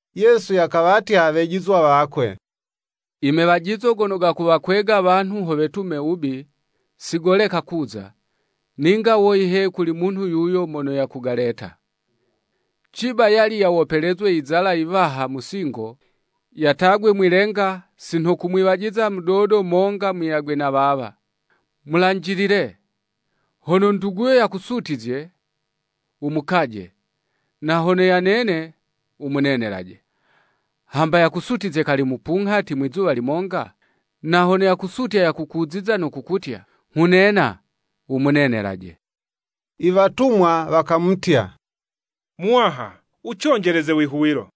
Yesu yakawatya wejizwa wakwe; “I mewajizo gono gakuwakwega wanhu ho wetume wubi; si goleka kuza, ninga woyi he kuli munhu yuyo mono yakugaleta! Ciba yali yawopelezwe lizala yiwaha mu singo, yatagwe mwi'lenga, si nha kumwiwajiza mudodo monga muyagwe na wawa. Mulanjilile! Hono nduguyo yakusutizye, wumukaje; na hono yanene wumunenelaje. Hamba yakusutizye kali mupunghati, mwizuwa limonga, na hono yakusutya yakukuziza no kukutya ‘Nghunena,’ wumunenelaje.” Iwatumwa wakamutya, “Muwaha, Wuconjeleze wihuwilo.”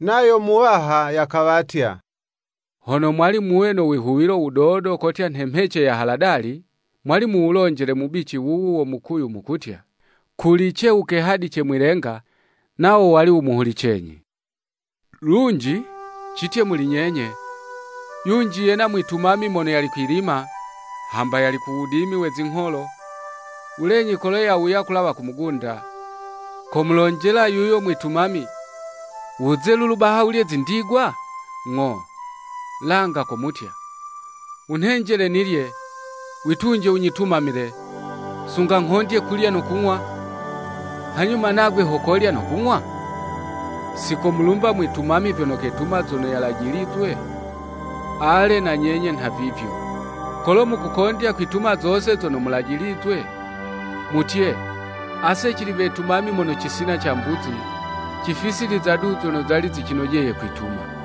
Nayo Muwaha yakawatya, Hono mwali muwe no wihuwilo wudodo kotya nhe mhece ya haladali, mwali muwulonjele mubici wuwu wo mukuyu mukutya, kulice wukehadice mwi'lenga, nawo wali wumuhulicenyi. “Lunji, citye muli nyenye, yunji yena mwitumami mono yali kwi'lima, hamba yali ku wudimi we zingholo; wulenyi kolo yawuya, kulawa ku mugunda, komulonjela yuyo mwitumami, ‘Wuze lulu baha wulye zindigwa?’ Ng'o, langa komutya, ‘Wunhenjele nilye; witunje, wunyitumamile, sunga nghondye kulya no kung'wa, hanyuma nagwe ho kolya no kung'wa?’ Si komulumba mwitumami vyono ketuma zono yalajilizwe? Ale na nyenye nhavivyo, kolo mukukondya kwituma zose zono mulajilizwe, mutye, ‘Ase cili wetumami mono cisina cambuzi, cifisiliza du zono zali zicinojeye kwituma.'"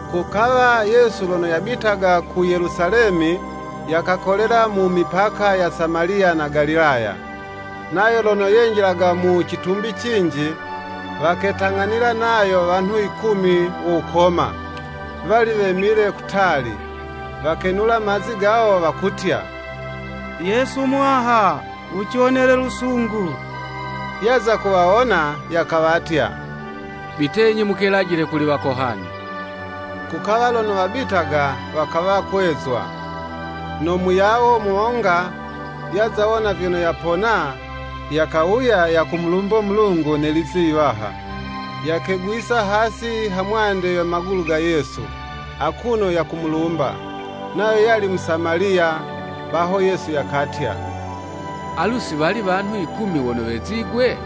Kukawa Yesu lono yabitaga ku Yelusalemi, yakakolela mu mipaka ya Samaliya na Galilaya. Nayo lono yenjilaga mu citumbi cinji, waketang'anila nayo wanhu yikumi wo wukoma, wali wemile kutali. Wakenula mazi gawo, wakutya, “Yesu Muwaha, Wuciwonele lusungu.” Yaza kuwawona, yakawatya, “Bitenyi mukelajile kuli wakohani.” Kukawa lono wabitaga, wakawa kwezwa. No muyawo monga, yaza wona vyono yapona, yakawuya yakumulumbo Mulungu ne lizi yiwaha; yakegwisa hasi ha mwande ye magulu ga Yesu, akuno yakumulumba. Nayo yali Musamaliya. Baho Yesu yakatya, “Alu, si wali wanhu yikumi wono wezigwe?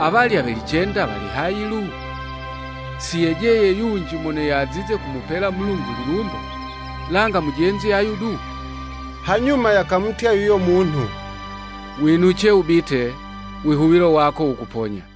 Awalya we licenda wali hayi lu? Si yejeye yunji mono yazize kumupela Mulungu lilumbo, langa mujenzi ayu du?” Hanyuma yakamutya yuyo munhu, “Winuce wubite, wihuwilo wako wukuponya.”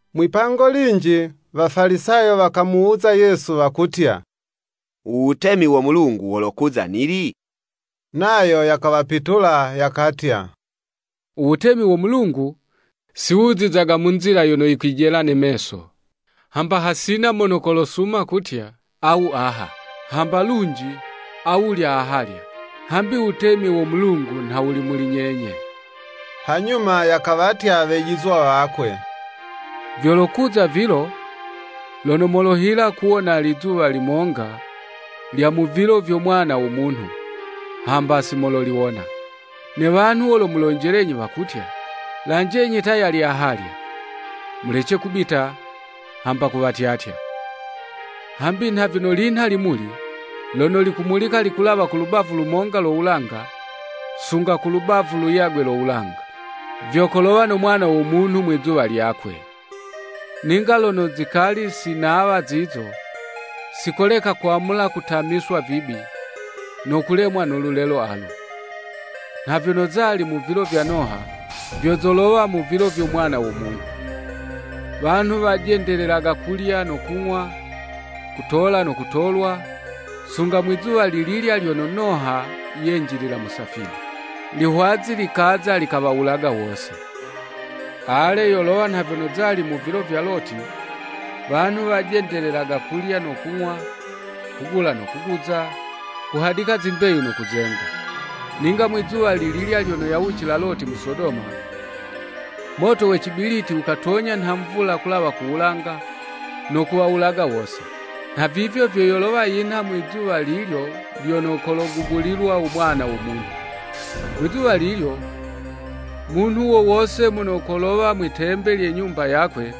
Mwipango linji, Wafalisayo wamuwuza Yesu wakutya, “U wutemi wo Mulungu wolokuza nili?” Nayo yakawapitula, yakatya, “U wutemi wo Mulungu si wuzizaga mu nzila yono yikwijela ne meso. Hamba hasina mono kolosuma kutya, ‘Awu aha.’ Hamba lunji, ‘Awulya ahalya.’ Hambi wutemi wo Mulungu nha wuli muli nyenye.” Hanyuma yakawatya wejizwa wakwe, vyolokuza vilo, lono molohila kuwona lizuwa limonga, lya mu vilo vyo Mwana wo Munhu, hamba si mololiwona. Ne wanhu wolomulonjelenyi wakutya, “Lanjenyi ta yali ahalya.” Mulece kubita, hamba kuwatyatya. Hambi nha vyono linha limuli, lono likumulika likulawa ku lubavu lumonga lo wulanga, sunga ku lubavu luyagwe lo wulanga; vyo kolowa no Mwana wo Munhu mwizuwa lyakwe. Ninga lono zikali si nawa zizo, sikoleka kwamula kutamiswa vibi, no kulemwa no lulelo alu. Nha vyono zali mu vilo vya Noha, vyo zolowa vilo vyo Mwana wo Munhu. Wanhu wajendelelaga kulya no kung'wa, kutola no kutolwa, sunga mwi'zuwa lililya lyono Noha yenjilila mu safina. Lihwazi likaza, likawawulaga wose. Ale, yolowa nha vyono zali mu vilo vya Loti; wanhu wajendelelaga kulya no kung'wa, kugula no kuguza, kuhadika zimbeyu no kuzenga. Ninga mwizuwa lililya lyono yawucila Loti mu Sodoma, moto we cibiliti wukatonya nha mvula kulawa ku wulanga, no kuwawulaga wose. Nhavivyo vyo yolowa yinha mwizuwa lilyo lyono kologubulilwa u Mwana wo Munhu. “Mwizuwa lilyo, munhu wo wose mono kolowa mwi'tembe lye nyumba yakwe,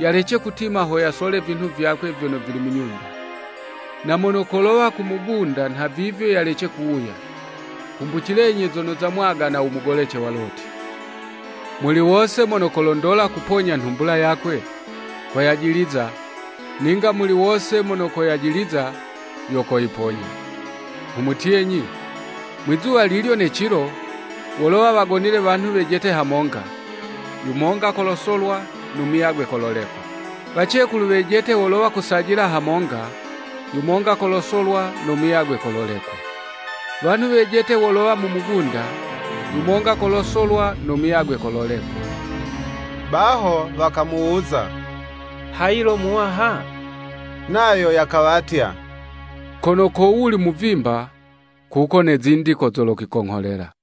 yalece kutima ho yasole vinhu vyakwe vyono vili mu nyumba. Na mono kolowa ku mugunda nhavivyo yalece kuwuya. Kumbucilenyi zono zamwagana u mugolece wa Loti. Muli wose mono kolondola kuponya nhumbula yakwe, koyajiliza, ninga muli wose mono koyajiliza, yo koyiponya. Nghumutyenyi, mwizuwa lilyo ne cilo, wolowa wagonile wanhu wejete hamonga, yumonga kolosolwa, no muyagwe kololekwa. Wacekulu wejete wolowa wakusajila hamonga; yumonga kolosolwa, no muyagwe kololekwa. [ “Wanhu wejete wolowa mu mugunda; yumonga kolosolwa, no muyagwe kololekwa.]” Baho wakamuwuza, “Hayi lo Muwaha?” Nayo yakawatya, “Kono ko wuli muvimba, kuko ne zindi ko zolokwikongholela.”